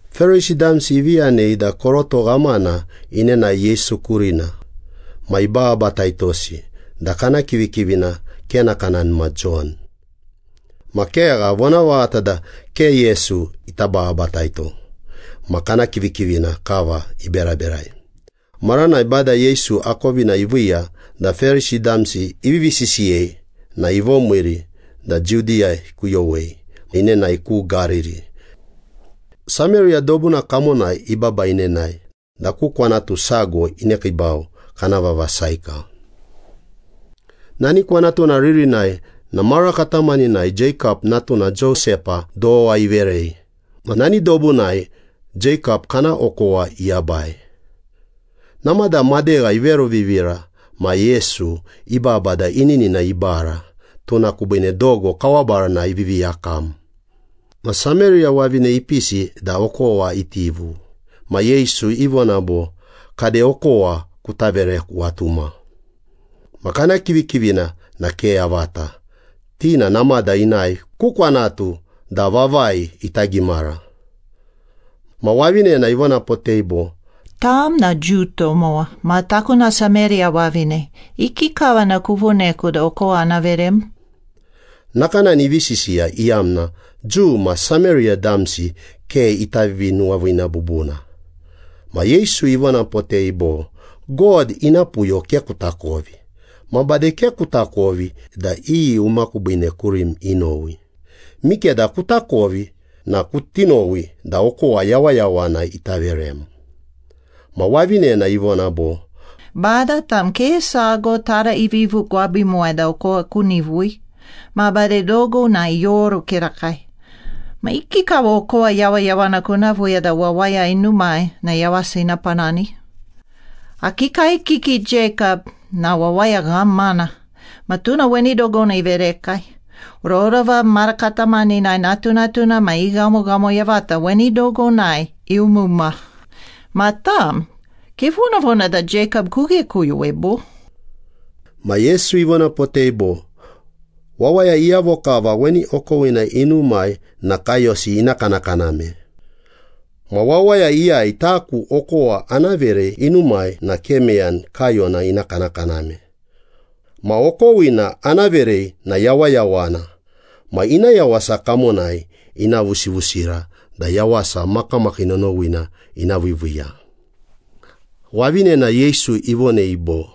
Perisi damsi ivi yanei da koroto ghamana inenae Yesu kurina ma ibababataitosi da kana kivikivina, ke nakanani ma Jon. Ma kegha, vonavaghata da ke Yesu ita bababataito ma kana kivikivina kava iberaberai. Maranai Bada Yesu akovina iviiya da Perisi damsi ivivi sisiyei na ivomiiri da Judiya ikuyowei inenae ku Gariri. Sameriya dobuna kamonai ibaba inenae da ku kwanatu sago inekiibau, kana vava Saika. Nani kwanatuna ririnai na mara katamaninai Jeikap, natuna Josepa dowa iverei. Ma nani dobunai Jeikap kana okowa iyabai. Namada madegha iveruvivira ma Yesu ibaba da ininina ibara, tuna kubiine dogo kawa baranai ivivi yakam. Ma Sameriya wavine ipisi da okowa itivu. Ma Yesu ivona bo, “Kade, okowa kuta vereku atuma.” Ma kana kivikivina na ke yavata, ti na namada inae ku kwanatu da vavai ita gimara. Ma wavinena ivonapotei bo, “Tam na Jiu tomowa ma taku na Sameriya wavine. Ikikava na kuvoneku da okowa ana verem?” Nakanani ivi sisiya iyamna Jiu ma Sameriya damsi ke ita vivinuwaviina bubuna. Ma Yesu ivonapotei bo, “God ina puyo ke kutakovi ma bade ke kutakovi da iyi uma kubiine kurim inowi. Mikeda kutakovi na kuti nowi da okowa yawayawana ita verem.” Ma wavinena ivona bo, “Bada, tam ke sago taraivivu gwabimuwai da okowa kunivui. Ma bade dogo na ioru kirakai. Ma ikikava okowa yawayawana kuna viiya da wawaya inumai na yawasa ina panani? Akii kaekiki Jeikap na wawaya ghamana ma tuna weni dogona iverekai. Rorova mara katamaninai natunatuna ma i ghamoghamo yavata weni dogonai iumuma. Ma tam, kevonavona da Jeikap kughekuyowei, bo?” Ma Yesu ivonapotei bo, “Wawaya iyavo kava weni okowina inumai na kaiyosi ina kanakaname. Ma wawaya iyai taku okowa ana verei inumai na ke meyani kaiyona ina kanakaname. Ma okowina ana verei na yawayawana ma ina yawasa kamonai ina vusivusira da yawasa makamakii nonowina ina viiviiya.” Wavinena Yesu ivonei bo,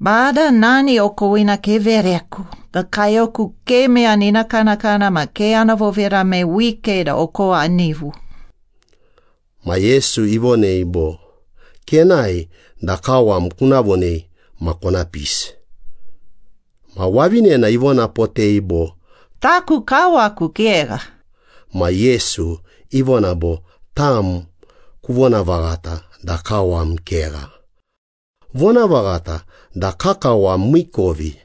“Bada, nani okowina kevereku da kaiyoku ke meyani ina kanakana ma ke ana vovirame wike da okowa anivu.” Ma Yesu ivonei bo, “Kenae da kawam kuna vonei ma kona pisi.” Ma wavinena ivonapotei bo, “Taku kawaku kegha.” Ma Yesu ivona bo, “Tam kuvonavaghata da kawam kegha. Vonavaghata da kakawam miikovi.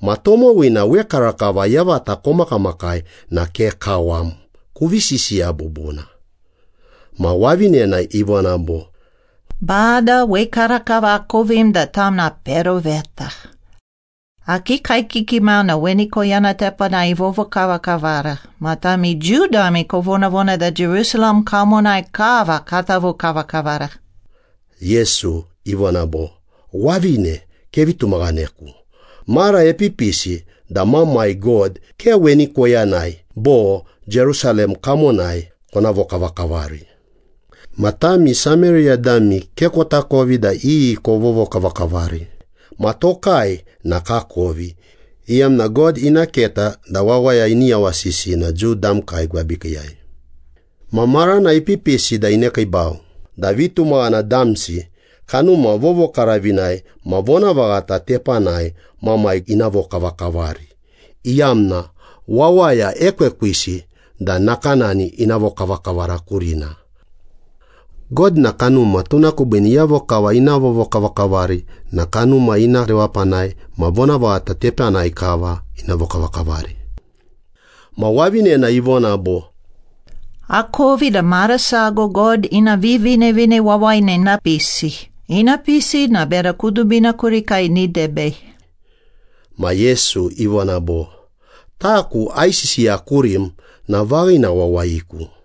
Ma tomowina wekarakava yavata komakamakai na ke kawam. Kuvi sisiya bubuna.” Ma wavinena ivona bo, “Bada, wekarakava akovim da tam na peroveta. Akii kaekiki mau na weni koyana tepanai ivovokavakavara, ma tami Jiu dami kovonavona da Jerusalem kamonai kava kata vokavakavara.” Yesu ivona bo, “Wavine, kevi tumaghaneku. Mara epipisi da Mamai God ke weni koyanai bo Jerusalem kamonai kona vokavakavari. Ma tami Sameriya dami ke kotakovi da iyi kovovokavakavari ma tokai na kakovi, iyamna God ina keta da wawaya ini yawasisi na Jiu damkai gwabikiiyai. Ma marana ipipisi da inekiibau da vitumaghana damsi Kanuma Vovokaravinai ma vonavaghata tepanai Mamai ina vokavakavari, iyamna wawaya ekwekwisi da nakanani ina vokavakavara kurina. God na kanuma, tuna kubiine iyavo kava ina vovokavakavari na Kanuma ina rewapanai ma vonavaghata tepanai kava ina vokavakavari.” Ma wavinena ivona bo, “Akovi da mara sago God Ina Vivinevine Wawayina ina pisi. Ina pisi na bera kudubina kurikai ini debei.” Ma Yesu ivona bo, “Taku aisisiya kurim na vaghina wawayiku.”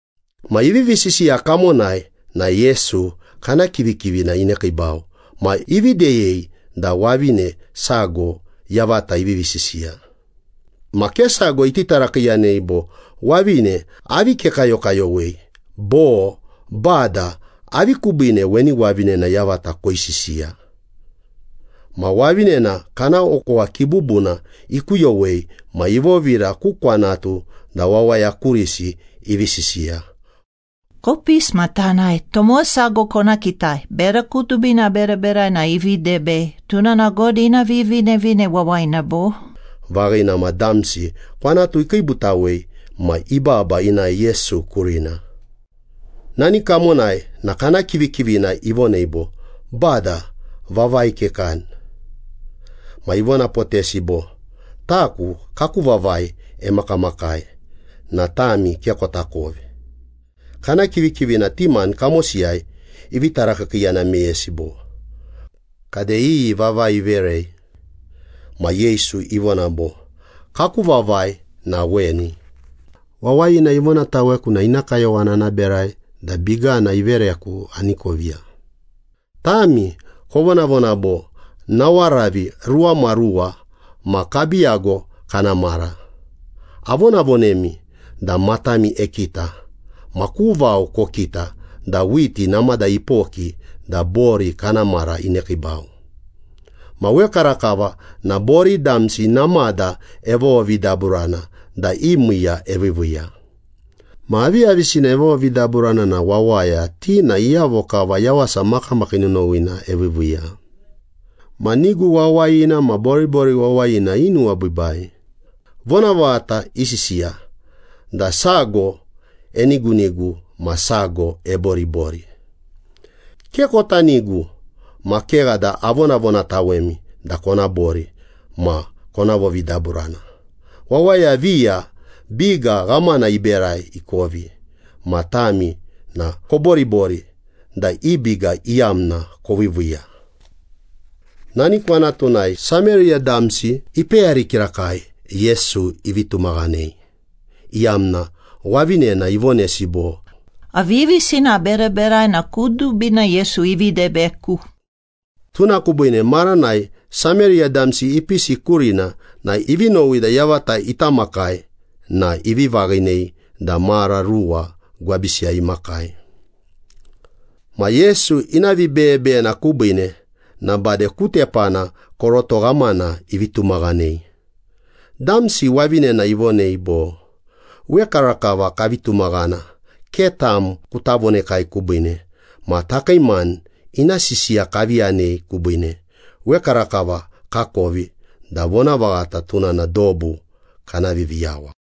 Ma ivivi sisiya kamonai na Yesu kana kivikivina inekiibau ma ivi deyei da wavine sago yavata ivivi sisiya. Ma ke sago iti tarakiiyanei bo, “Wavine, avi kekayokayowei?” Bo, “Bada, avi kubiine weni wavinena yavata koisisiya?” Ma wavinena kana okowa kibubuna ikuyowei ma ivovira ku kwanatu da wawaya kurisi ivi sisiya. “Kopisi ma tanae, tomowa sago kona kitai. Bera kudubina aberaberai na ivi debei. Tuna na God ina Vivinevine Wawayina, bo?” Vaghina ma damsi kwanatu ikiibutawei ma ibaba inae Yesu kurina. Nani kamonai na kana kivikivina ivonei bo, “Bada, vavai kekani.” Ma ivonapotesi bo, “Taku kaku vavai emakamakai na tami ke kotakovi.” Kana kivikivina ti mani kamosiyai ivi tarakiikiiyana meyesi bo, “Kade, iyi vavai iverei?” Ma Yesu ivona bo, “Kaku vavai na weni. Wawayina ivonataweku na ina kayowana ana berai da bigana ivereku ani koviya. Tami kovonavona bo, ‘Nawaravi ruwamaruwa ma kabiiyago kana mara.’ Avonavonemi da matami ekita, ma ku vao kokita da whiti namada ipoki da bori kana mara inekiibau. Ma wekarakava na bori damsi namada evovovidaburana da i miiya eviiviiya. Ma aviyavisina evovovidaburana na wawaya, ti na iyavo kava yawasa makamakii nonowina eviiviiya. Ma nigu wawayina ma boribori wawayina inuwabiibai. Vonavaghata isisiya da, ‘Sago enigunigu ma sago eboribori.’ Ke kota nigu ma kegha da avonavonatawemi da kona bori ma kona vovidaburana. Wawaya viya biga ghamana iberai ikovi, ma tami na koboribori da i biga iyamna koviiviiya.” Nani kwanatunai Sameriya damsi ipeyari kirakai Yesu ivi tumaghanei, iyamna wavinena ivonesi bo, “Aviyavisina aberaberai na kudubina Yesu ivi debeku.” Tuna kubiine maranai Sameriya damsi ipisi kurina na ivi nowi da yavata ita makai na ivi vaghinei da mara ruwa gwabisiyai imakai. Ma Yesu ina vibeyebeyena kubiine na bade ku tepana koroto ghamana ivi tumaghanei. Damsi wavinena ivonei bo, “Wekarakava kavi tumaghana, ke tam kuta vonekai kubiine, ma takii mani ina sisiya kavi yanei kubiine. Wekarakava kakovi da vonavaghata, tuna na dobu kana Viviyawa.”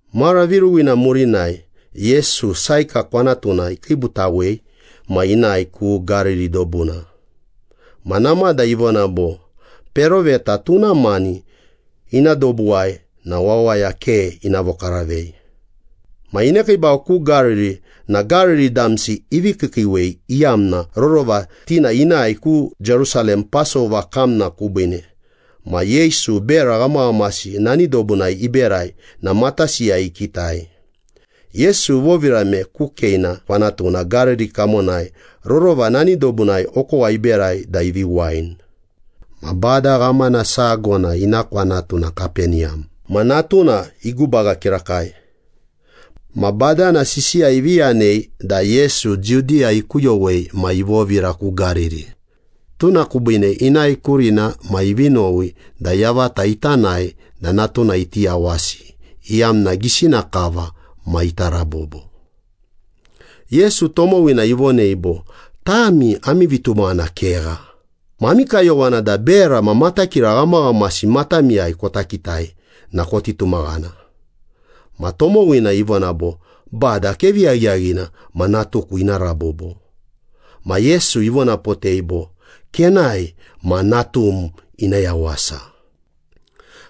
Mara viruwina murinai Yesu, Saika kwanatuna ikiibutawei ma inae ku Gariri dobuna. Ma namada ivona bo, “Peroveta tuna mani ina dobuwai na wawaya ke ina vokaravei.” Ma inekiibau ku Gariri na Gariri damsi ivi kiikiiwei, iyamna rorova ti na inae ku Jerusalem Pasova kamna kubiine ma Yesu bera ghamaghamasi nani dobunai iberai na matasiyai ikitai. Yesu ivovirame ku Keina kwanatuna Gariri kamonai, rorova nani dobunai okowa iberai da ivi wain. Ma bada ghamana sago na ina kwanatu na Kapeniyam ma natuna igubaga kirakai. Ma badana sisiya ivi yanei da Yesu Judiya ikuyowei ma ivovira ku Gariri. Tuna kubiine inae kurina ma ivi nowi da yavata ita nae da natuna iti yawasi, iyamna gisina kava ma ita rabobo. Yesu tomowina ivonei bo, “Tami ami vitumaghana kegha, ma ami kayowana da bera ma matakira ghamaghamasi matamiyai kona kitai na koni tumaghana.” Ma tomowina ivona bo, “Bada, kevi yaghiyaghina ma natuku ina rabobo.” Ma Yesu ivonapotei bo, “Kenae ma natum ina yawasa.”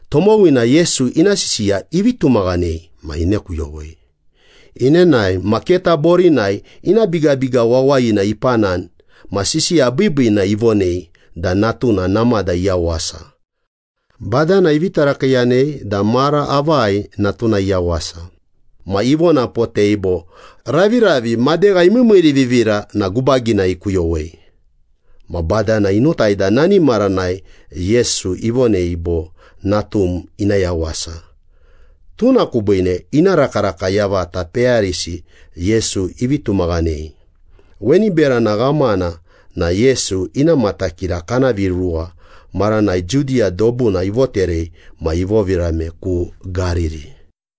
Tomowina Yesu ina sisiya ivi tumaghanei ma inekuyowei. Inenae ma keta borinai ina bigabiga wawayina ipanani ma sisiya biibiina ivonei da natuna namada iyawasa. Badana ivi tarakiiyanei da mara avai natuna iyawasa. Ma ivonapotei bo, “Raviravi madegha imiimiirivivira na gubagina ikuyowei.” Ma badana inotai da nani maranai Yesu ivonei bo, “Natum ina yawasa.” Tuna kubiine ina rakaraka yavata peyarisi Yesu ivi tumaghanei. Weni berana ghamana na Yesu ina matakira kana viruwa maranai Judiya dobuna ivoterei ma ivovirame ku Gariri.